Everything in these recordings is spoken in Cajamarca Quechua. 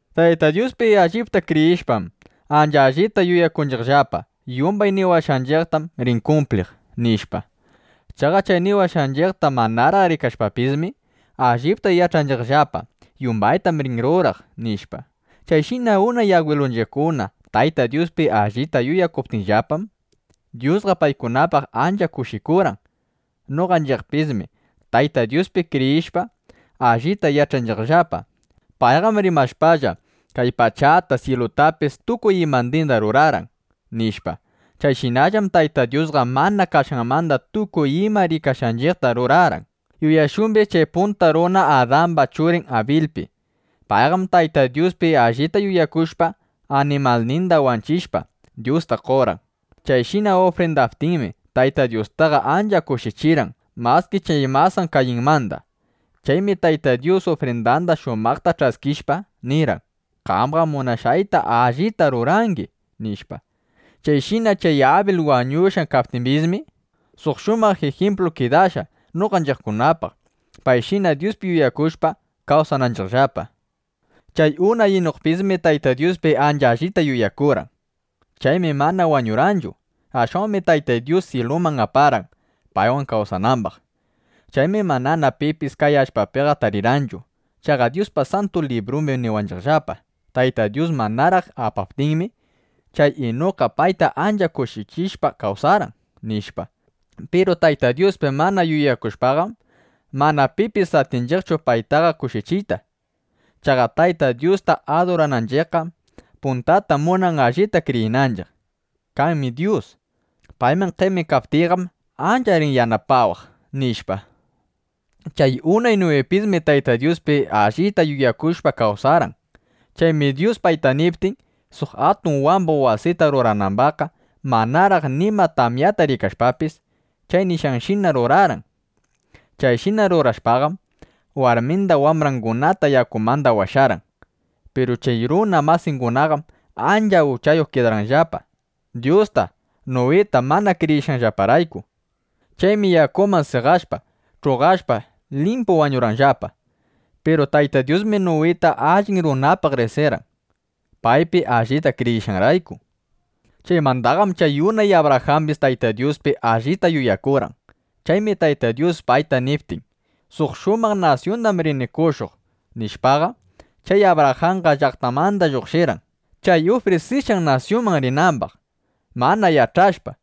Tayta Dyuspi allipta kriyishpam, ancha allita yuyakunchiqllapa: Yumbay niwashqanchiqtam rin kumpliq, nishpa. Chaqa chay niwashqanchiqta manaraq rikashpapismi, allita yach'anchiqllapa: Yumbaytam rin ruraq, nishpa. Chayshina unay agwilunchiqkuna Tayta Dyuspi allita yuyakuptinllapam, Dyusqa paykunapaq ancha kushikurqan. Noqanchiqpismi Tayta Dyuspi kriyishpa, allita yach'anchiqllapa: Payqam rimashpalla, kay pachata, syilutapis, tukuy imandinda rurarqan, nishpa. Chayshinallam Tayta Dyusqa mana kashqanmanda tukuy ima rikashqanchiqta rurarqan. Yuyashumbis chay (punta runa Adamba churin) Abilpi. Payqam Tayta Dyuspi allita yuyakushpa, animalninda wanchishpa, Dyusta qorqan. Chayshina ufrindaptinmi, Tayta Dyustaqa ancha kushichirqan maski chay masan Kayinmanda. Chaymi Tayta Dyusqa ufrindanda shumaqta ch'askishpa, nirqan: “Qamqam munashqayta allita rurangi”, nishpa. Chayshina chay Abil wañushqa kaptimbismi, suq shumaq ijimplu kidashqa noqanchiqkunapaq, payshina Dyuspi yuyakushpa, kawsananchiqllapa. Chay unay Inukpismi Tayta Dyuspi ancha allita yuyakurqan. Chaymi mana wañurqanchu. Ashwanmi Tayta Dyus syiluman aparqan, paywan kawsanambaq. Chaymi manana pipis kay allpapiqa tarirqanchu. Chaqa Dyuspa Santu Librumbim niwanchiqllapa: Tayta Dyus manaraq apaptinmi, chay Inukqa payta ancha kushichishpa kawsarqan, nishpa. Piru Tayta Dyuspi mana yuyakushpaqam, mana pipis atinchiqchu paytaqa kushichiyta. Chaqa Tayta Dyusta adurananchiqqam, puntata munan allita kriyinanchiq: Kanmi Dyus. Payman qemikaptiyqam, ancha rin yanapawaq, nishpa. Chay unay Nuwipismi Tayta Dyuspi allita yuyakushpa kawsarqan. Chaymi Dyus payta niptin, suq atun wambuq wasita ruranambaqqa, manaraq nima tamyata rikashpapis, chay nishqanshina rurarqan. Chayshina rurashpaqam, warminda wambrangunata yakumanda washarqan. Piru chay runa masingunaqam ancha uchayuq kidarqanllapa, Dyusta, Nuwita mana kriyishqanllaparayku. Chaymi yakuman seqashpa, ch'uqashpa, limpu wañurqanllapa. Piru Tayta Dyusmi Nuwita allin runapaq riqsirqan, paypi allita kriyishqanrayku Chaymandaqam chay unay Abrajambis Tayta Dyuspi allita yuyakurqan. Chaymi Tayta Dyus payta niptin: “Suq shumaq nasyundam rini qoshuq”, nishpaqa, chay Abrajanqa llaqtanmanda lluqshirqan, chay ufrisishqan nasyunman rinambaq. Mana yach'ashpa: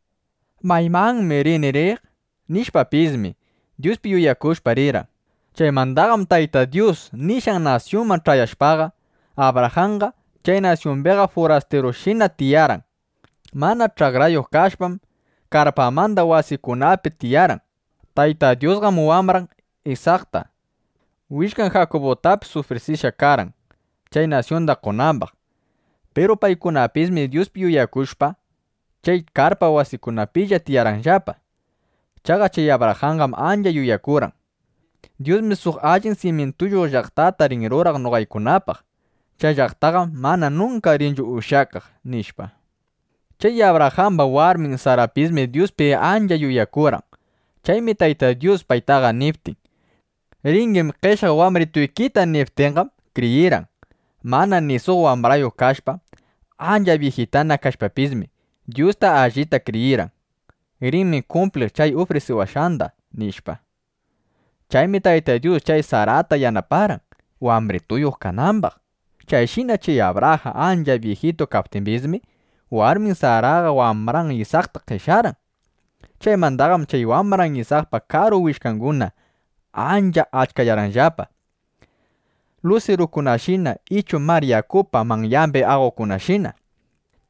¿Maymanmi rini riq? nishpapismi, Dyuspi yuyakushpa rirqan. Chaymandaqam Tayta Dyus nishqan nasyunman ch'ayashpaqa, Abrajanqa chay nasyumbiqa furastirushina tiyarqan. Mana ch'akrayuq kashpam, karpamanda wasikunapi tiyarqan. Tayta Dyusqam wambran Isakta, willkan Jakubutapis ufrisishqa karqan, chay nasyunda qonambaq. Piru paykunapismi Dyuspi yuyakushpa, chay karpa wasikunapilla tiyarqanllapa. Chaqa chay Abrajanqam ancha yuyakurqan: Dyusmi suq allin simyintuyuq llaqtata rin ruraq noqaykunapaq. Chay llaqtaqam mana nunka rinchu ushyakaq, nishpa. Chay Abrajamba warmin Sarapismi Dyuspi ancha yuyakurqan. Chaymi Tayta Dyus paytaqa niptin: “Ringim qeshyaq wambrituykita”, nishpaqa, kriyirqan. Mana ni suq wambrayuq kashpa, ancha byijitana kashpapismi, Dyusta allita kriyirqan: Rinmi kumpliq chay ufrisiwashqanda, nishpa. Chaymi Tayta Dyus chay Sarata yanaparqan, wambrituyuq kanambaq. Chayshina chay Abrajan ancha byijitu kaptimbismi, warmin Saraqa wambran Isakta qeshyarqan. Chaymandaqam chay wambran Isakpa karu willkanguna ancha achkayarqanllapa, lusirukunashina ichu mar yakupa manyambi aqokunashina.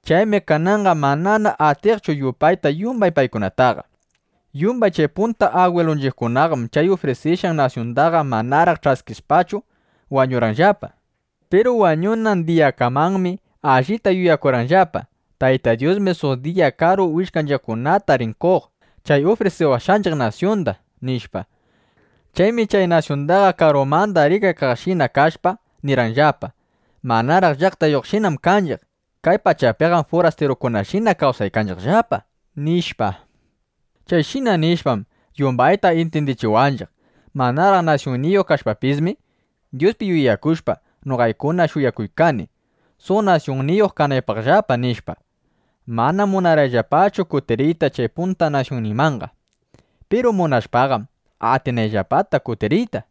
Chaymi kananqa manana atinchiqchu yupayta yumbay paykunataqa. Yumbay chay punta agwilunchiqkunaqam chay ufrisishqan nasyundaqa manaraq ch'askishpachu wañurqanllapa. Piru wañunan diyakamanmi allita yuyakurqanllapa: Tayta Dyusmi suq diya karu willkanchiqkunata rin qoq chay ufrisiwashqanchiq nasyunda, nishpa. Chaymi chay nasyundaqa karumanda rikaykaqshina kashpa, nirqanllapa: “Manaraq llaqtayuqshinam kanchiq. Kay pachapiqam furastirukunashina kawsanchiqllapa”, nishpa. Chayshina nishpam, yumbayta intyindichiwanchiq: “Manaraq nasyunniyuq kashpapismi, Dyuspi yuyakushpa, noqaykuna shuyakuykani, suq nasyunniyuq kanaypaqllapa”, nishpa. Manam munarqanllapachu kutiriyta chay punta nasyunninmanqa. Piru munashpaqam, atinanllapata kutiriyta.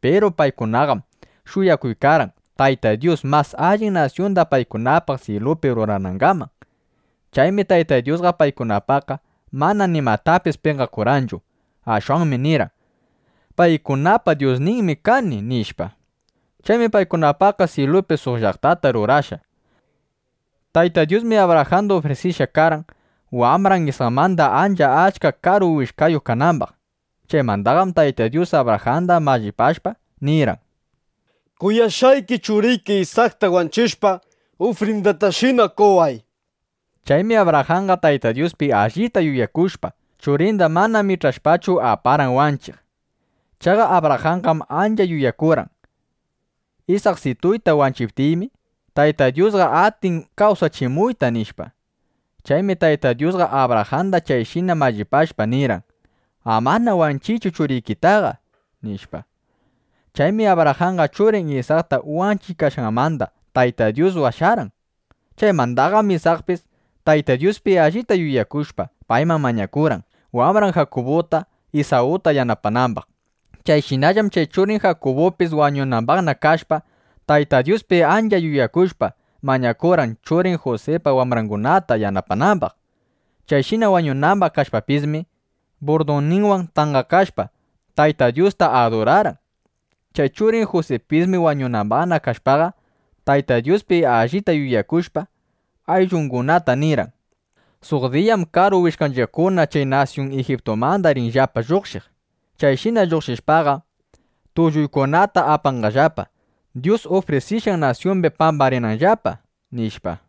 Piru paykunaqam shuyakuykarqan, Tayta Dyus mas allin nasyunda paykunapaq syilupi ruranangaman. Chaymi Tayta Dyusqa paykunapaqqa mana nimatapis penqakurqanchu. Ashwanmi nirqan: “Paykunapa Dyusninmi kani”, nishpa. Chaymi paykunapaqqa syilupi suq llaqtata rurashqa. Tayta Dyusmi Abrajanda ufrisishqa karqan, wambran Isakmanda ancha achka karu willkayuq kanambaq. Chaymandaqam Tayta Dyus Abrajanda mallipashpa, nirqan: “Kuyashqayki churiki Isakta wanchishpa, ufrindatashina qoway”, nishpa. Chaymi Abrajanqa Tayta Dyuspi allita yuyakushpa, churinda mana mich'ashpachu, aparqan wanchiq. Chaqa Abrajanqam ancha yuyakurqan: Isaksituyta wanchiptiymi, Tayta Dyusqa atin kawsachimuyta, nishpa. Chaymi Tayta Dyusqa Abrajanda chayshina mallipashpa, nirqan: “Amana wanchiychu churikitaqa”, nishpa. Chaymi Abrajanqa churin Isakta wanchiykashqanmanda Tayta Dyus washarqan. Chaymandaqam Isakpis Tayta Dyuspi allita yuyakushpa, payman mañakurqan, wambran Jakubuta, Isawta yanapanambaq. Chayshinallam chay churin Jakubupis wañunambaqna kashpa, Tayta Dyuspi ancha yuyakushpa, mañakurqan, churin Jusipa wambrangunata yanapanambaq. Chayshina wañunambaq kashpapismi, burdunninwan tanqakashpa, Tayta Dyusta adurarqan. Chay churin Jusipismi, wañunambaq kashpaqa, Tayta Dyuspi allita yuyakushpa, ayllungunata nirqan: “Suq diyam karu willkanchiqkuna kay nasyun Ijiptumanda rinllapa lluqshiq. Chayshina lluqshishpaqa, tulluykunata apanqallapa, Dyus ufrisishqan nasyumbi pambarinanllapa”, nishpa.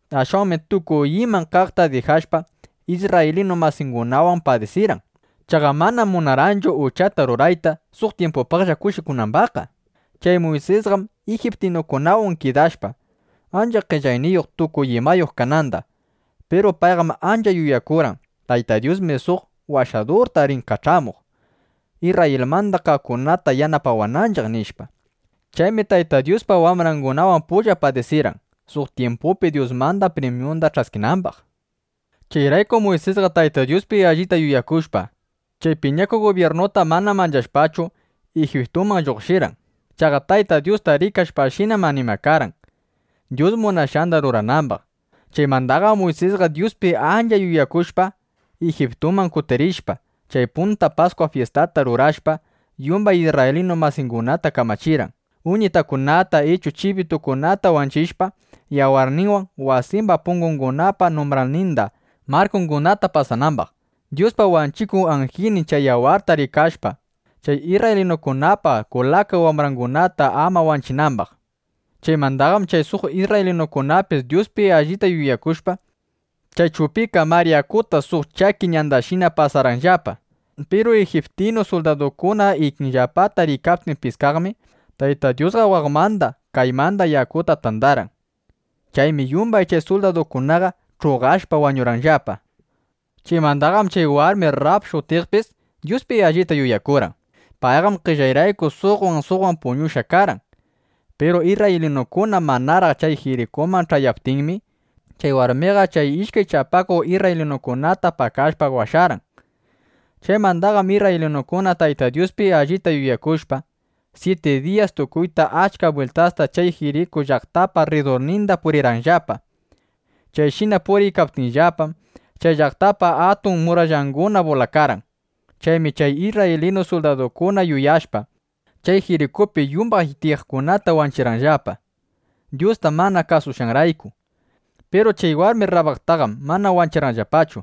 Ashwanmi tukuy iman kaqta dijashpa, isrraylinu masingunawan padisirqan. Chaqa manam munarqanchu uchata rurayta, suq tyimpupaqlla kushikunambaqqa. Chay Muysisqam ijiptinukunawan kidashpa, ancha qellayniyuq, tukuy imayuq kananda. Piru payqam ancha yuyakurqan: Tayta Dyusmi suq Washadurta rin kach'amuq, Isrrayilmanda kaqkunata yanapawananchiq, nishpa. Chaymi Tayta Dyuspa wambrangunawan pulla padisirqan, suq tyimpupi Dyusmanda primyunda ch'askinambaq. Chayraykum Muysisqa Tayta Dyuspi allita yuyakushpa, chay piñakuq gubyirnuta mana manchashpachu, Ijiptumanda lluqshirqan. Chaqa Tayta Dyusta rikashpashinam animakarqan, Dyus munashqanda ruranambaq. Chaymandaqam Muysisqa Dyuspi ancha yuyakushpa, Ijiptuman kutirishpa, chay punta Paskwa fyistata rurashpa, yumbay isrraylinu masingunata kamachirqan, (uñitakunata ichu chibitukunata wanchishpa), yawarninwan wasimba pungungunapa numbralninda, markungunata pasanambaq, Dyuspa wanchikuq anjilnin chay yawarta rikashpa, chay isrraylinukunapa kulaka wambrangunata ama wanchinambaq. Chaymandaqam chay suq isrraylinukunapis Dyuspi allita yuyakushpa, chay Chupika Mar Yakuta suq chaki ñandashina pasarqanllapa. Piru ijiptinu suldadukuna ikinllapata riykaptin piskaqmi, Tayta Dyusqa waqmanda, kaymanda yakuta tandarqan. Chaymi yumbay chay suldadukunaqa ch'uqashpa wañurqanllapa. Chaymandaqam chay warmi Rrab shutiqpis Dyuspi allita yuyakurqan. Payqam qellayrayku suqwan suqwan puñushqa karqan. Piru isrraylinukuna manaraq chay Jirikuman ch'ayaptinmi, chay warmiqa chay ishkay chapakuq isrraylinukunata pakashpa washarqan. Chaymandaqam isrraylinukuna Tayta Dyuspi allita yuyakushpa, syiti diyas tukuyta achka bwiltasta chay Jiriku llaqtapa rridurninda purirqanllapa. Chayshina puriykaptinllapam, chay llaqtapa atun murallanguna bulakarqan. Chaymi chay isrraylinu suldadukuna yaykushpa, chay Jirikupi yumbay tiyaqkunata wanchirqanllapa, Dyusta mana kasushqanrayku. Piru chay warmi Rrabtaqam mana wanchirqanllapachu.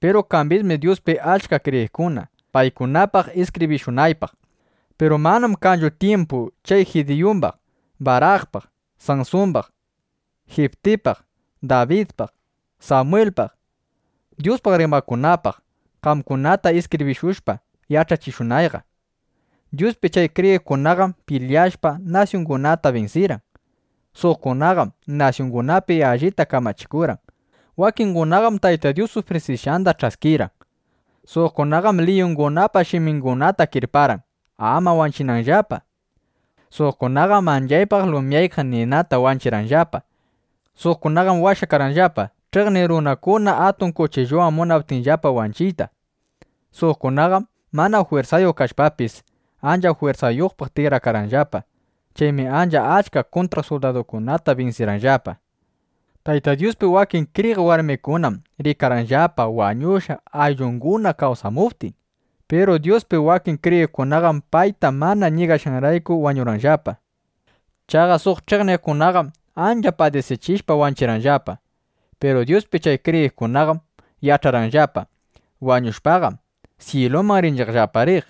Piru kambismi Dyuspi achka kriyiqkuna, paykunapaq iskibrishunaypaq. Piru manam kanchu tyimpu chay Jidiyumbaq, Barakpaq, Sansumbaq, Jiptipaq, Dabidpaq, Samwilpaq, Dyuspaq rimaqkunapaq, qamkunata iskibrishushpa yach'achishunayqa. Dyuspi chay kriyiqkunaqam pilyashpa, nasyungunata binsirqan. Suqkunaqam nasyungunapi allita kamachikurqan. Wakingunaqam Tayta Dyus ufrisishqanda ch'askirqan. Suqkunaqam liyungunapa shimingunata kirparqan, ama wanchinanllapa. Suqkunaqam manchaypaq lumyaykaq ninata wanchirqanllapa. Suqkunaqam washakarqanllapa, ch'iqniq runakuna atun kuchilluwan munaptinllapa wanchiyta. Suqkunaqam mana jwirsayuq kashpapis, ancha jwirsayuqpaq tikrakarqanllapa. Chaymi ancha achka kuntraq suldadukunata binsirqanllapa. Tayta Dyuspi wakin kriyiq warmikunam rikarqanllapa wañushqa ayllunguna kawsamuptin. Piru Dyuspi wakin kriyiqkunaqam payta mana ñigashqanrayku wañurqanllapa. Chaqa suq ch'iqniqkunaqam ancha padisichishpa wanchirqanllapa. Piru Dyuspi chay kriyiqkunaqam yach'arqanllapa: Wañushpaqam, syiluman rinchiqllapa riq,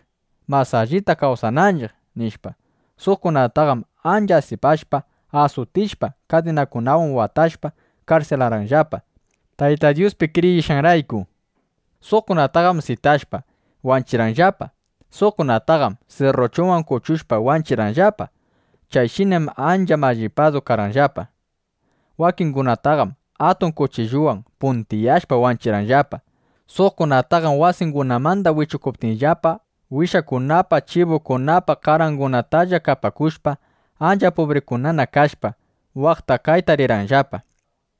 mas allita kawsananchiq, nishpa. Suqkunataqam ancha asipashpa, asutishpa, kadinakunawan watashpa, karsilarqanllapa, Tayta Dyuspi kriyishqanrayku. Suqkunataqam sitashpa, wanchirqanllapa. Suqkunataqam sirruchuwan kuchushpa, wanchirqanllapa. Chayshinam ancha mallipadu karqanllapa. Wakingunataqam atun kuchilluwan puntiyashpa wanchirqanllapa. Suqkunataqam wasingunamanda wichukuptinllapa, wishakunapa, chibukunapa qarangunatalla kapakushpa, ancha pubrikunana kashpa, waqta, kayta rirqanllapa.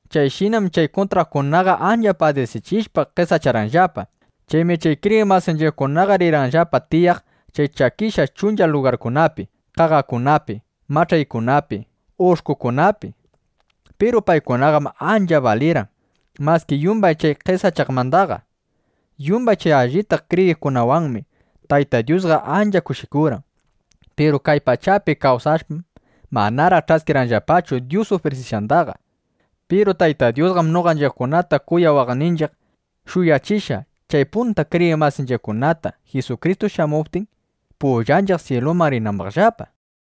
Chayshinam chay kuntraqkunaqa ancha padisichishpa qesacharqanllapa. Chaymi chay kriyiq masinchiqkunaqa rirqanllapa tiyaq chay chakishqa chuncha lugarkunapi, qaqakunapi, mach'aykunapi, ush'kukunapi. Piru paykunaqam ancha balirqan maski yumbay chay qesachaqmandaqa. Yumbay chay allita kriyiqkunawanmi Tayta Dyusqa ancha kushikurqan. Piru kay pachapi kawsashpam, manaraq ch'askirqanllapachu Dyus ufrisishqandaqa. Piru Tayta Dyusqam noqanchiqkunata kuyawaqninchiq, shuyachishqa chay punta kriyiq masinchiqkunata, Jisukristu shamuptin, pullanchiq syiluman rinambaqllapa.